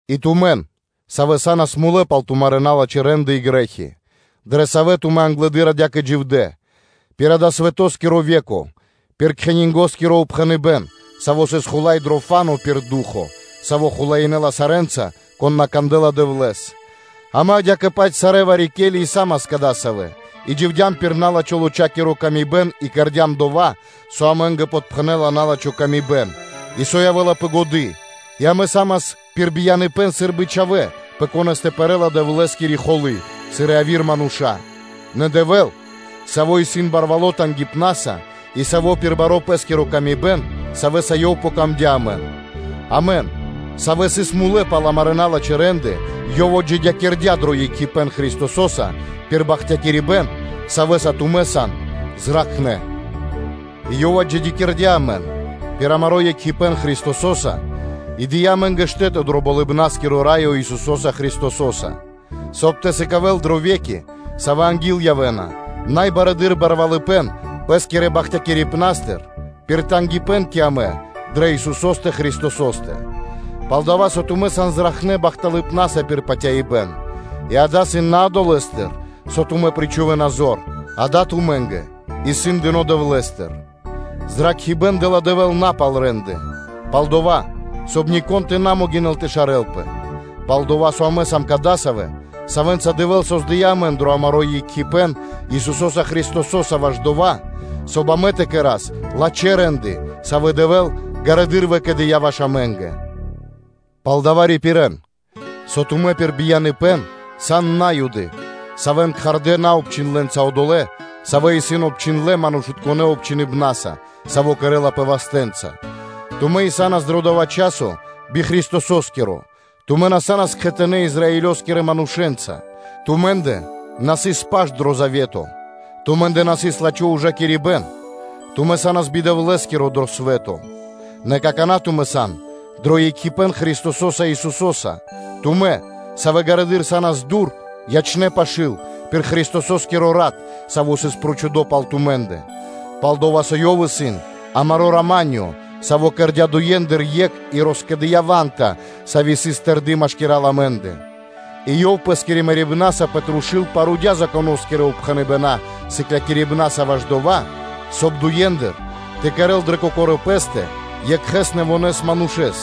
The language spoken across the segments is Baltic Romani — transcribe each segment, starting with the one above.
И тумэн, савэ́ са́нас мулэ́ пал тумарэ́ налачхэ́ рэ́нды и грэ́хи, дрэ савэ́ тумэ́ англэды́р адя́кэ дживдэ́, пир дава́ свэтоскиро ве́ко, пир кхенингоскиро упхэныбэ́н, саво́ сыс хула́й дро фа́но (воздухо), пир ду́хо (фа́но), саво́ хулаинэла сарэ́нца, кон на кандэ́ла Дэвлэ́с: амэ адя́кэ-паць сарэ́ вари-ке́ли и са́мас кадасавэ́ и дживдям пир на́лачхо лочакиро (плотякиро) тырдыпэ́н и кэрдя́м дова́, со амэ́нгэ подпхэнэла на́лачхо камибэн и со явэ́ла пэ годы́, и амэ са́мас пир бияныпэ́н сы́рбы чхавэ́, пэ конэ́стэ пэрэ́ла Дэвлэ́скири холы́, сыр и яви́р мануша́: нэ Дэвэ́л, Саво́ исын барвало́ тангипнаса, и Саво́ пир бари Пэ́скири ла́ска, савья́са Ёв притырдыя амэн, амэн, савэ́ сыс мулэ́ пал амарэ́ налачхэ́ рэ́нды, Ёв отджидякирдя́ дро екхипэ́н Христосо́са, пир бахтякирибэ́н, савэ́са тумэ́ сан зракхнэ́, и Ёв отджидякирдя́ амэн пир амаро́ екхипэ́н Христосо́са и дыя́ амэ́нгэ штэ́то дро Болыбна́скиро Раё Исусо́са Христосо́са, соб (кай) тэ сыкавэ́л дрэ ве́ки, савэ́ анги́л явэ́на, най барэды́р барвалыпэ́н Пэ́скирэ бахтякирибнастыр пир тангипэ́н кэ амэ дрэ Христосо́стэ Исусо́стэ. Палдава́ со тумэ́ сан зракхнэ́ бахталыпнаса пир патяибэ́н, и дава́ исын на долэ́стыр, со тумэ́ причхувэна зор, дава́ тумэ́нгэ исын дыно́ Дэвлэ́стыр; зракхибэ́н дэ́ла Дэвэ́л на пал рэ́нды (де́лы), пал-дова́, соб (кай) нико́н тэ на могинэл тэ шарэлпэ. Пал-дова́ со амэ сам кадасавэ́, савэ́нца Дэвэ́л создыя́ амэн дро амаро́ екхипэ́н Исусо́са Христосо́са ваш дова́, соб (кай) амэ тэ кэра́с лачхэ́ рэ́нды, савэ́ Дэвэ́л ґарэдыр выкэдыя́ ваш амэ́нгэ. Палдава́ рипирэ́н, со тумэ́ пир бияныпэ́н сан На́юды, савэ́н кхардэ́ наобчхиндлэнца одолэ́, савэ́ исын обчхиндлэ́ манушытконэ́ обчхиныбнаса, саво́ кэрэ́лапэ вастэ́нца; тумэ́ и са́нас дро дова́ часо би Христосо́скиро, тумэ́ на са́нас кхэтанэ́ Израилёскирэ манушэ́нца, тумэ́ндэ на сыс паш дро Завето, тумэ́ндэ на сыс лачхо́ ужакирибэ́н, тумэ́ са́нас би Дэвлэ́скиро дро свэ́то: нэ какана́ тумэ́ сан дро екхипэ́н Христосо́са Исусо́са, тумэ́, савэ́ ґарэдыр са́нас дур, ячнэ́ пашы́л, пир Христосо́скиро Рат, саво́ сыс прочхудо пал тумэ́ндэ. Пал-дова́ со Ёв исын амаро́ рама́нё (миро), Саво́ кэрдя́ дуендыр екх и роскэдыя ва́нта, сави́ сыс тэрды машкира́л амэ́ндэ. И Ёв Пэ́скирэ мэрибнаса пэ трушу́л парудя Законо́скирэ упхэныбэна́ сыклякирибнаса ваш дова́, соб (кай) дуендыр тэ кэрэ́л дрэ Кокорэ́ Пэ́стэ екхэ нэвонэ́ манушэ́с,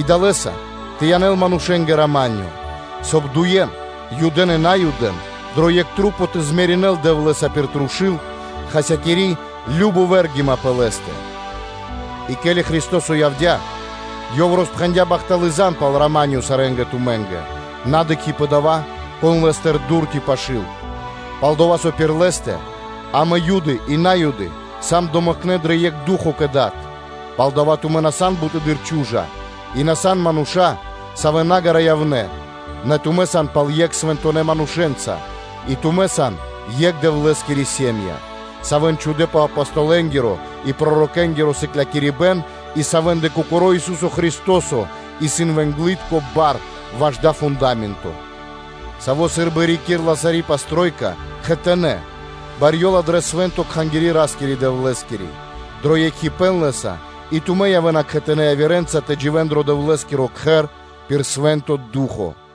и далэ́са тэ янэл манушэ́нгэ рама́нё (миро), соб (кай) дуе́н (Юдэ́н и Наюдэн) дро екх маса́ тэ примиринэл Дэвлэ́са пир трушу́л, хасякири кажно вэргима пэ Лэ́стэ, и ке́ли Христо́со явдя́, Ёв роспхэндя́ бахталы́ зан (звесь) пал рама́нё (миро) сарэ́нгэ тумэ́нгэ, на дыкхи́ пэ дова́, кон сыс Лэ́стыр дур ци пашы́л, пал-дова́ со пир Лэ́стэ амэ Юды и На́юды сам домэкнэ дро екх Ду́хо (Фа́но) кэ Дад. Палдава́ тумэ́ на сан буты́р чу́жа, и тумэ́ на сан мануша́, савэ́ на ґара́ явнэ́, нэ тумэ́ сан пал екх Свэнтонэ́ манушэ́нца, и тумэ́ сан екх Дэвлэ́скири сэ́м΄я(ири́), савэ́н чхудэ́ пэ Апостолэнгиро и пророкэнгиро сыклякирибэ́н, и савэ́ндэ Кокоро́ Ису́со Христо́со исын вэнглытко бар ваш дава́ фунда́менто, Саво́ сы́рбы рикирла саро́ кхэр кхэтанэ́, барьёла дрэ свэ́нто кхангири́ Ра́скирэ-Дэвлэ́скири, дро екхипэ́н Лэ́са и тумэ́ явэ́на кхэтанэ́ явирэнца тэ дживэ́н дро Дэвлэ́скиро Кхэр пир Свэ́нто Ду́хо (Фа́но).